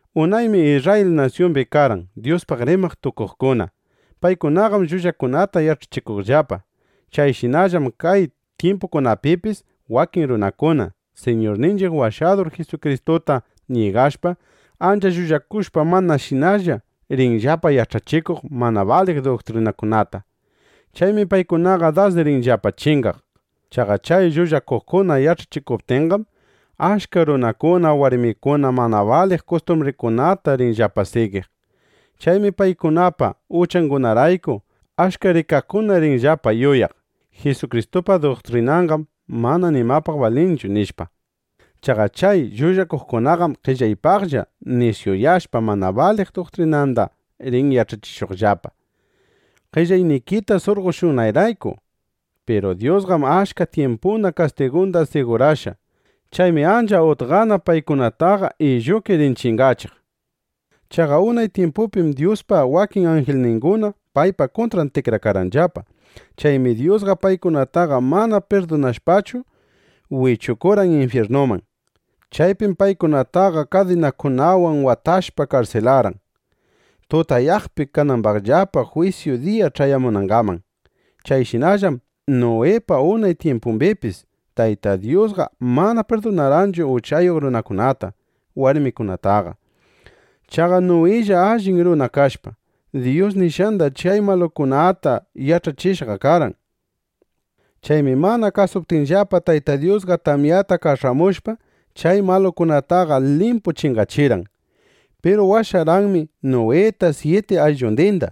Unaymi Isrrayil nasyumbi karqan Dyuspaq rimaq tukuqkuna. Paykunaqam llullakunata yach'achikuqllapa. Chayshinallam kay tyimpunchiqpipis wakin runakuna, Siñurninchiq Washadur Jisukristuta ñigashpa, ancha llullakushpa manashinalla rinllapa yach'achikuq mana baliq duktrinakunata. Chaymi paykunaqa das rinllapa chingaq. Chaqa chay llullakuqkuna yach'achikuptinqam, achka runakuna, warmikuna mana baliq kustumbringunata rinllapa sigiq. Chaymi paykunapa uchangunarayku, achka rikaqkuna rinllapa yuyaq: Jisukristupa duktrinanqam mana nimapaq balinchu, nishpa. Chaqa chay llullakuqkunaqam qellaypaqlla nisyuyashpa, mana baliq duktrinanda rin yach'achishuqllapa, qellaynikita surqoshunanrayku. Piru Dyusqam achka tyimpuna kastigunda sigurashqa. Chaymi ancha utqana paykunataqa illuki rin chingachiq. Chaqa unay tyimpupim Dyuspa wakin anjilninguna paypa kuntran tikrakarqanllapa. Chaymi Dyusqa paykunataqa mana pirdunashpachu, wichurqan infyirnuman. Chaypim paykunataqa kadinakunawan watashpa karsilarqan, tutayaqpi kanambaqllapa jwisyu diya ch'ayamunangaman. Chayshinallam Nuwipa unay tyimpumbipis Tayta Dyusqa mana pirdunarqanchu uchayuq runakunata, warmikunataqa. Chaqa Nuwilla allin runa kashpa, Dyus nishqanda chay malukunata yach'achishqa karqan. Chaymi mana kasuptinllapa, Tayta Dyusqa tamyata kach'amushpa, chay malukunataqa limpu chingachirqan. Piru washarqanmi Nuwita, syiti ayllundinda.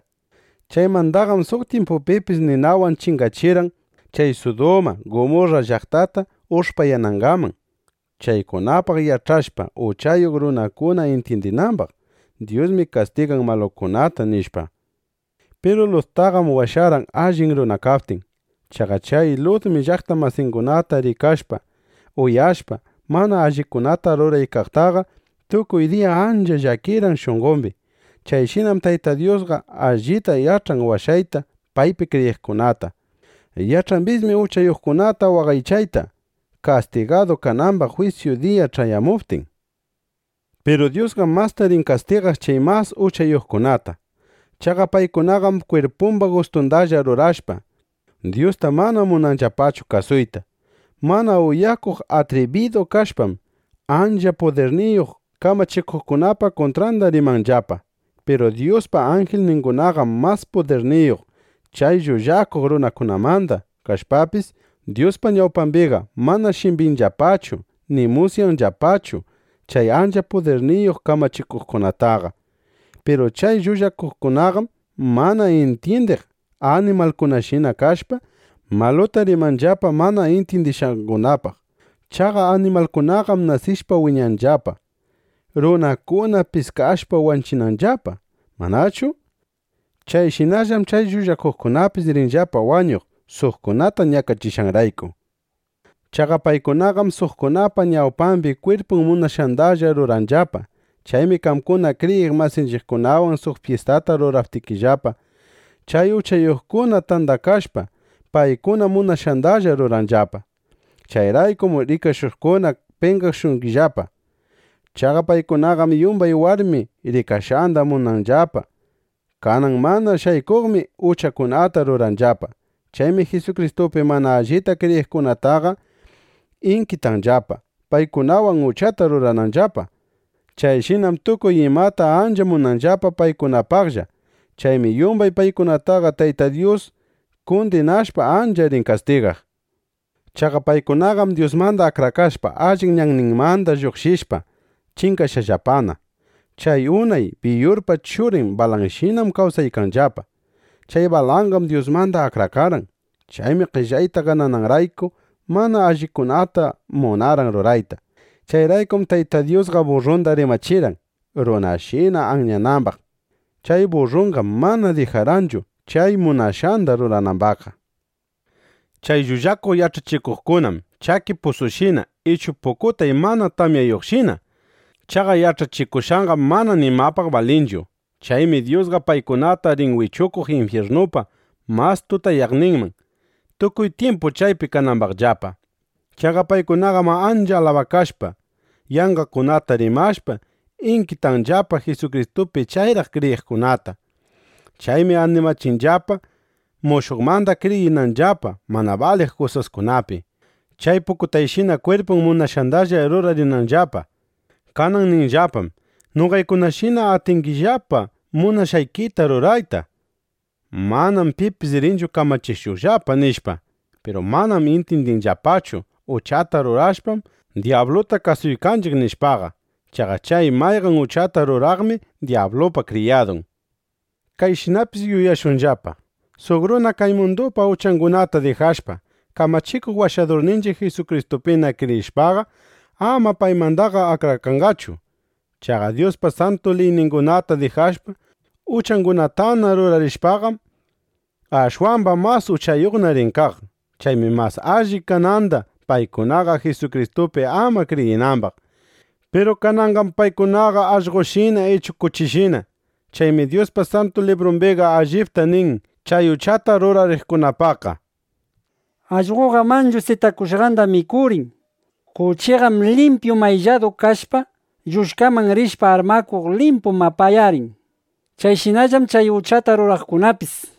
Chaymandaqam suq tyimpupipis ninawan chingachirqan chay Suduma llaqtata, Gumurra llaqtata ush'payanangaman, chaykunapaq yach'ashpa, uchayuq runakuna intyindinambaq: Dyusmi kastigan malukunata, nishpa. Piru Luttaqam washarqan, allin runa kaptin. Chaqa chay Lutmi llaqta masingunata rikashpa, uyashpa, mana allikunata ruraykaqtaqa, tukuy diya ancha llakirqan shunqombi. Chayshinam Tayta Dyusqa allita yach'an washayta paypi kriyiqkunata. Yach'ambismi uchayuqkunata waqaychayta, kastigadu kanambaq jwisyu diya ch'ayamuptin. Piru Dyusqam masta rin kastigaq chay mas uchayuqkunata. Chaqa paykunaqam kwirpumba gustundalla rurashpa, Dyusta mana munanllapachu kasuyta. Mana uyakuq atribidu kashpam, ancha pudirniyuq kamachikuqkunapa kuntranda rimanllapa. Piru Dyuspa anjilningunaqam mas pudirniyuq chay llullakuq runakunamanda kashpapis, Dyuspa ñawpambiqa mana shimbinllapachu ni musyanllapachu chay ancha pudirniyuq kamachikuqkunataqa. Piru chay llullakuqkunaqam mana intyindiq animalkunashina kashpa, maluta rimanllapa mana intyindishqangunapaq. Chaqa animalkunaqam nasishpa wiñanllapa, runakuna piskashpa wanchinanllapa, ¿manachu? Chayshinallam chay llullakuqkunapis rinllapa wañuq, suqkunata ñakachishqanrayku. Chaqa paykunaqam suqkunapa ñawpambi kwirpun munashqandalla ruranllapa. Chaymi qamkuna kriyiq masinchiqkunawan suq fyistata ruraptikillapa, chay uchayuqkuna tandakashpa, paykuna munashqandalla ruranllapa. Chayraykum rikashuqkuna penqashungillapa. Chaqa paykunaqam yumbay warmi rikashqanda munanllapa. Kanan mana shaykuqmi uchakunata ruranllapa. Chaymi Jisukristupi mana allita kriyiqkunataqa inkitanllapa, paykunawan uchata rurananllapa. Chayshinam tukuy imata ancha munanllapa paykunapaqlla. Chaymi yumbay paykunataqa Tayta Dyus kundinashpa, ancha rin kastigaq. Chaqa paykunaqam Dyusmanda akrakashpa, allin ñanninmanda lluqshishpa, chingashqallapana. Chay unay Biyurpa churin Balanshinam kawsaykanllapa. Chay Balanqam Dyusmanda akrakarqan. Chaymi qellayta ganananrayku, mana allikunata munarqan rurayta. Chayraykum Tayta Dyusqa burrunda rimachirqan, runashina anyanambaq. Chay burrunqam mana dijarqanchu chay munashqanda ruranambaqqa. Chay llullakuq yach'achikuqkunam chaki pusushina ichu pukutay mana tamyayuqshina. Chaqa yach'achikushqanqam mana nimapaq balinchu. Chaymi Dyusqa paykunata rin wichuq infyirnupa mas tutayaqninman, tukuy tyimpu chaypi kanambaqllapa. Chaqa paykunaqam ancha alabakashpa, yanqakunata rimashpa, inkitanllapa Jisukristupi chayraq kriyiqkunata. Chaymi animachinllapa mushuqmanda kriyirinanllapa mana baliq kusaskunapi, chay paykunashina kwirpun munashqandalla rurarinanllapa. Kanan ninllapam: “Noqaykunashina atingillapa munashqaykita rurayta. Manam pipis rinchu kamachishuqllapa”, nishpa. Piru manam intyindinllapachu: Uchata rurashpam, dyabluta kasuykanchiq, nishpaqa. Chaqa chay mayqan uchata ruraqmi dyablupa kriyadun. Kayshinapis yuyashunllapa: Suq runa kay mundupa uchangunata dijashpa, Kamachikuq Washadurninchiq Jisukristupina kriyishpaqa, ama paymandaqa akrakanqachu. Chaqa Dyuspa santu liyningunata dijashpa, uchangunatana rurarishpaqam, ashwamba mas uchayuqna rin kaq. Chaymi mas alli kananda paykunaqa Jisukristupi ama kriyinambaq. Piru kananqam paykunaqa allqoshina ichu kuchishina. Chaymi Dyuspa Santu Librumbiqa allipta nin chay uchata rurariqkunapaqqa: “Allqoqam manchu sitakushqanda mikurin. Kuchiqam limpyu maylladu kashpa, lluchkaman rishpa armakuq, limpu mapayarin”, nishpa. Chayshinallam chay uchata rurariqkunapis.